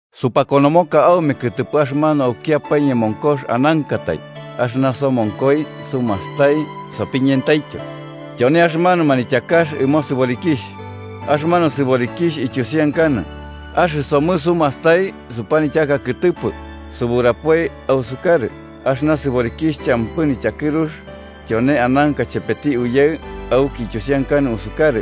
Supakonomoka aume kɨtɨpɨ axɨmanu aukiapae ñemonkox anankatai, axɨna somonkoi sumastai sopiñentaityo. Tyone axɨmanu manityakax ɨmo sɨborikixh. Axɨmanu sɨborikixh ityusiankanɨ: axɨsomɨ sumastai supanityaka kɨtɨpɨ, suburapoi ausukarɨ axɨna sɨborikixh champɨ nityakɨrux, tyone ananka chepeti Uyaɨ auki ityusiankanɨ usukarɨ.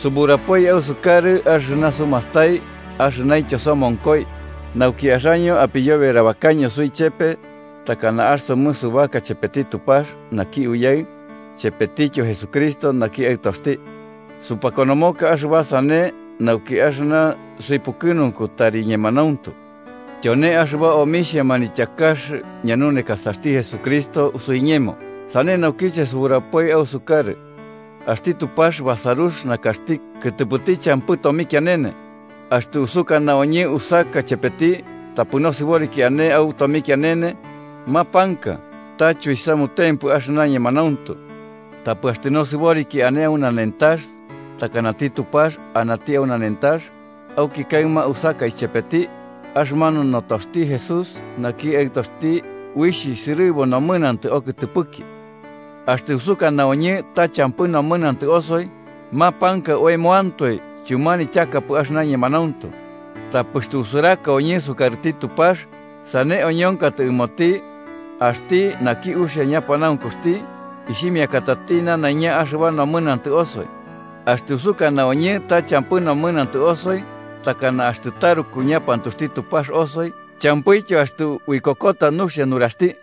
Suburapoi ausukarɨ, axɨna sumastai axɨnaintyo somonkoi, nauki axaño apiyoberabakaño suichepe, takana axɨsomɨ subaka chepeti Tupax, naki Uyaɨ, chepetityo Jesucristo naki Aɨtoxti. Supakonomoka axɨba sane nauki axɨna suipukɨnunku tari ñemanauntu. Tyone axɨba omixhia manityakax ñanunekasaxti Jesucristo suiñemo sane naukiche suburapoi ausukarɨ: axti Tupax basarux nakaxti kɨtɨpɨti champɨ tomikianene. Axtɨ usukana oñɨ usaka chepeti, tapɨ nosɨboriki ane au tomikianene, mapanka ta chuisamutempɨ axɨna ñemanauntu. Tapɨ axtɨ nosɨboriki ane au nanentax, takanati Tupax anati au nanentax, auki kaɨma usaka chepeti, axɨmanu notoxti Jesús naki Aɨtoxti uixh sɨrɨbu nomɨnantɨ okɨtɨpɨki. Axtɨ usukana oñɨ ta champɨ nomɨnantɨ osoi, mapanka oemoantoe chumanityakapɨ axɨna ñemanauntu. Tapɨ axtɨ usuraka oñɨ sukarɨti Tupax, sane oñonkatɨ ɨmoti, axti naki uxia ñapanaunkuxti, ixhimiakatati nanaiña axɨba nomɨnantɨ osoi. Axtɨ usukana oñɨ ta champɨ nomɨnantɨ osoi, takana axtɨ taruku ñapantuxti Tupax osoi champɨityo axtɨ uikokota nuxia nuraxti.